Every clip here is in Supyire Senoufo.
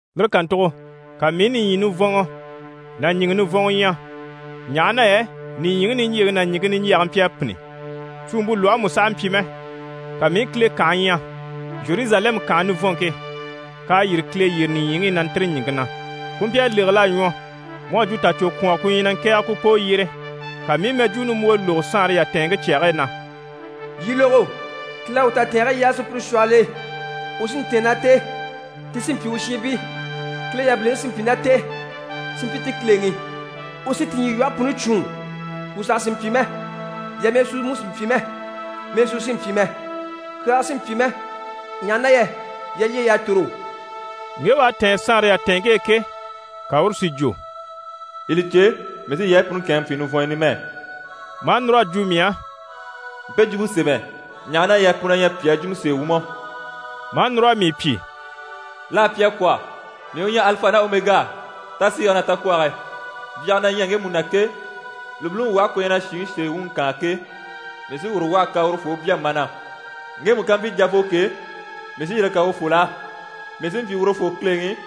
Lire kàntugo ka mii i nìɲyi nivɔnŋɔ ná ɲìŋɛ nivɔnŋɔ ɲya, ɲaha na yɛ nìɲyiŋi niɲjyeŋi ná ɲìŋke niɲjyɛge mpyi a pînni, suumpe lwɔhe mú sàha mpyi mɛ. Ka mii i Kile kànhe ɲya, Zheruzalɛmu kànhe nivɔnŋke, k'à yîri Kile yyére nìɲyiŋi i na ntîri ɲìŋke na. Ku mpyi a légel'a ɲwɔ mu à jwo tacwokwɔngɔ ku ɲyɛ na ŋkɛ̀ɛge ku poo yyére. Ka mii i mɛjwuu nimbwoo lógo saanre yatɛɛnŋke cyage e na: «Yii lógo! Kile à u tatɛɛnge yaa sùpyire shwɔhɔl'e, u sí n‑tɛ̀ɛn ná t'e, ti sí n‑pyi u shiinbii, Kile yabiliŋi sí n‑pyi ná t'e, si mpyi ti Kileŋi. U sí ti ɲyilwɔhe puni cwûun. Kwù saha sì n‑pyi mɛ, yamɛɛsuu mú sì n‑pyi mɛ, mɛɛsuu sì n‑pyi mɛ, kyaaga sì n‑pyi mɛ, ɲaha na yɛ yalyey'à tòro.» Ŋge u à tɛ̀ɛn saanre yatɛɛnŋke e ke, ka uru si jwo: «Yii li cè, mii sí yaayi puni kɛ̂ɛnŋɛ n‑pyi nivɔnyɔ numɛ.» Maa núr'a jwo mii á: «Mpe jwumpe sémɛ, ɲaha na yɛ pu na ɲyɛ pyàa jwumɔ sèe wumɔ!» Maa núr'a mii pyi: «L'à pyi a kwɔ̀. Mii u ɲyɛ Alifa ná Omega, tasiige ná takwɔge. Byage na ɲyɛ ŋgemu na ke, lùbiliŋi lwɔhe ku ɲyɛ na shìŋi sèe wuŋi kaan ke, mii sí uru lwɔhe kan urufoo u bya mana. Ŋgemu ká mpyi javoo ke, mii sí yire kan urufol'á. Mii sí n‑pyi urufoo Kileŋi,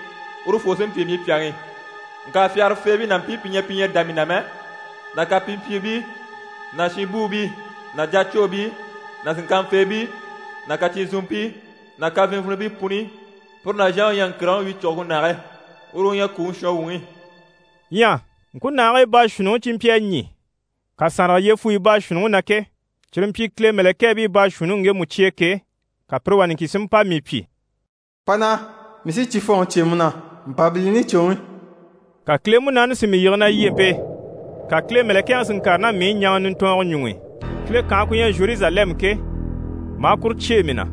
urufoo sí n‑pyi mii pyàŋi. Ŋka fyagarafeebii ná mpii pi ɲyɛ pi ɲyɛ a dá mii na mɛ, ná kapimpyiibii ná shinbuubii ná jacwoobii ná sìnŋkanfeebii ná kacyinzunmpii ná kafinivinibii puni, pire nàzhanŋi u ɲyɛ ŋkìrigiŋi wyicuguŋke nage. Uru u ɲyɛ kwùŋi shɔnwuŋi.» Ɲyɛ ŋkunahigii baashuunniŋi cyi mpyi a ɲî kasanrage yyefuyi baashuunniŋi na ke, cyire mpyi Kile mɛ̀lɛkɛɛbii baashuunniŋi ŋgemu cye e ke, ka pire wà niŋkin si mpa mii pyi: «Pa naha, mii sí cifɔnŋi cyêe mu na, Mpabilini cwoŋi.» Ka Kile Munaani si mii yige na lyempe e, ka Kile mɛ̀lɛkɛŋi si ŋkàre ná mii i ɲaŋa nintɔɔngɔ ɲuŋ'i, Kile kànhe ku ɲyɛ Zheruzalɛmu ke, maa kuru cyêe mii na.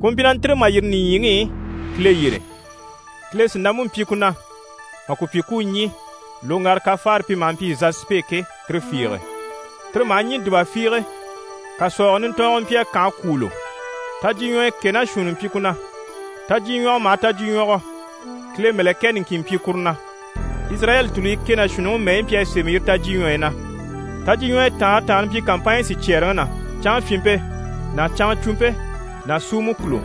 Ku mpyi na ntîri mà yîri nìɲyiŋi i Kile yyére. Kile sìnampe mpyi ku na mà ku pyi ku u ɲî loŋgara kafaare pi maha mpyi zasipe ke, tire fiige. Tire maha ɲî dùba fiige. Kàsɔɔgɔ nintɔɔngɔ mpyi a kànhe kwûulo. Tajyiɲwɔyɔ kɛ ná shuunni mpyi ku na. Tajyiɲwɔgɔ maha tajyiɲwɔgɔ, Kile mɛ̀lɛkɛ niŋkin mpyi kuru na. Izirayɛli tùluyi kɛ ná shuunniŋi mɛyi mpyi a sémɛ yire tajyiɲwɔyi na. Tajyiɲwɔyɔ taanre taanre mpyi kàmpanɲyi sicyɛɛreŋi na: canŋafyinmpe ná canŋacwumpe ná suumɔ kùlo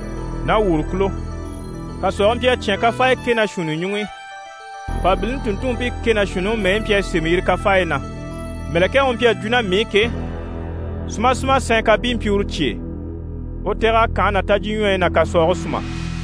ná wòro kùlo. Kàsɔɔge mpyi a cyán kafaaya kɛ ná shuunni ɲuŋ'i, Mpabilini tùnntunmpii kɛ ná shuunniŋi mɛyi mpyi a sémɛ yire kafaayi na. Mɛ̀lɛkɛŋi u mpyi a jwo ná mii i ke, súmasuma sɛɛn kàbii mpyi uru cye e, u tɛ̀g'a kànhe ná tajyiɲwɔyi ná kàsɔɔge súma.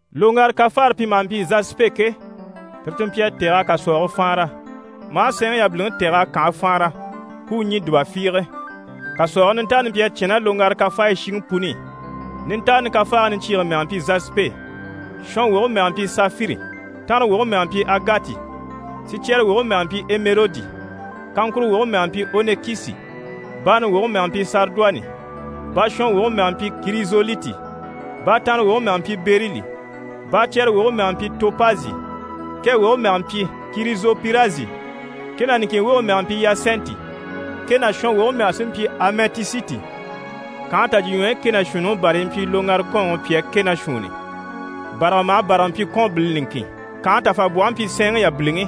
Loŋgara kafaare pi maha mpyi zasipe ke, tire ti mpyi a tɛ̀g'a kàsɔɔge faanra, maa sɛɛnŋi yabiliŋi tɛ̀g'a kànhe faanra, ku u ɲî dùba fiige. Kàsɔɔge nintaani mpyi a cyán ná loŋgara kafaayi shiŋi puni i. Nintaani kafaage niɲcyiige mɛge mpyi zasipe, shɔnwoge mɛge mpyi safiri, tanrawoge mɛge mpyi agati, sicyɛrewoge mɛge mpyi ɛmɛrodi, kaŋkuro woge mɛge mpyi onikisi, baani woge mɛge mpyi sariduwanɛ, baashɔnwoge mɛge mpyi kirizoliti, baatanrewoge mɛge mpyi berili, baacyɛrewoge mɛge mpyi topazi, kɛ woge mɛge mpyi kirizopirasi, kɛ ná niŋkin woge mɛge mpyi iyasɛnti, kɛ ná shɔnwoge mɛge sí mpyi amɛtisiti. Kànhe tajyiɲwɔyi kɛ ná shuunniŋi bàrayi mpyi loŋgara kɔ́ɔnŋi pyàa kɛ ná shuunni. Bàraga maha bàraga mpyi kɔ́ɔnbile niŋkin. Kànhe tafabwɔhe mpyi sɛɛnŋi yabiliŋi,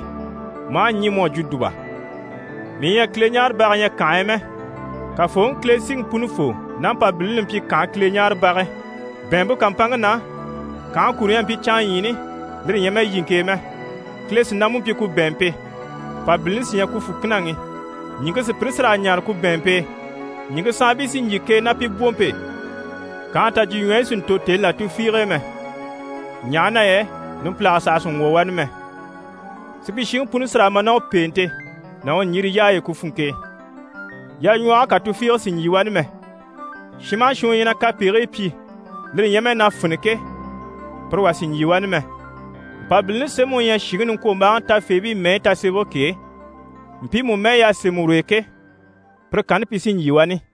maa ɲî mu à jwo dùba. Mii ɲyɛ a Kileɲaarebaga ɲya kànhe e mɛ. Kafooŋi Kile, Siŋi Punifoo ná Mpabilini li mpyi kànhe Kileɲaarebage. Bɛ̀ɛnmpe kàmpanŋke na, kànhe kuro ɲyɛ a mpyi canŋaɲyiini, lire ɲyɛ mɛ yiŋke e mɛ. Kile sìnampe mpyi ku bɛ̀ɛnmpe, Mpabilini sí ɲyɛ ku fùkinaŋi. Ɲìŋke sùpyire sí raa ɲaare ku bɛ̀ɛnmpe e, ɲìŋke saanbii sí n‑jyè k'e ná pi bwompe e. Kànhe tajyiɲwɔyi sì n‑tò tèni là tufiige e mɛ, ɲaha na yɛ numpilage saha sì n‑wwɔ̀ wani mɛ. Supyishiŋi puni sí raa ma ná u pèente ná u ɲjire yaay'e ku funŋke e. Yaɲwɔhɔge kà tufiige sì n‑jyè wani mɛ, shin maha shin u ɲyɛ na kapegigii pyi, lire ɲyɛ mɛ na fini ke, pire wà sì n‑jyè wani mɛ. Mpabilini sémɛŋi u ɲyɛ shìŋi niŋkwombaaŋi tafeebii mɛyi tasemɛge ke, mpiimu mɛyi y'à sémɛ ur'e ke, pire kanni pi sí n‑jyè wani.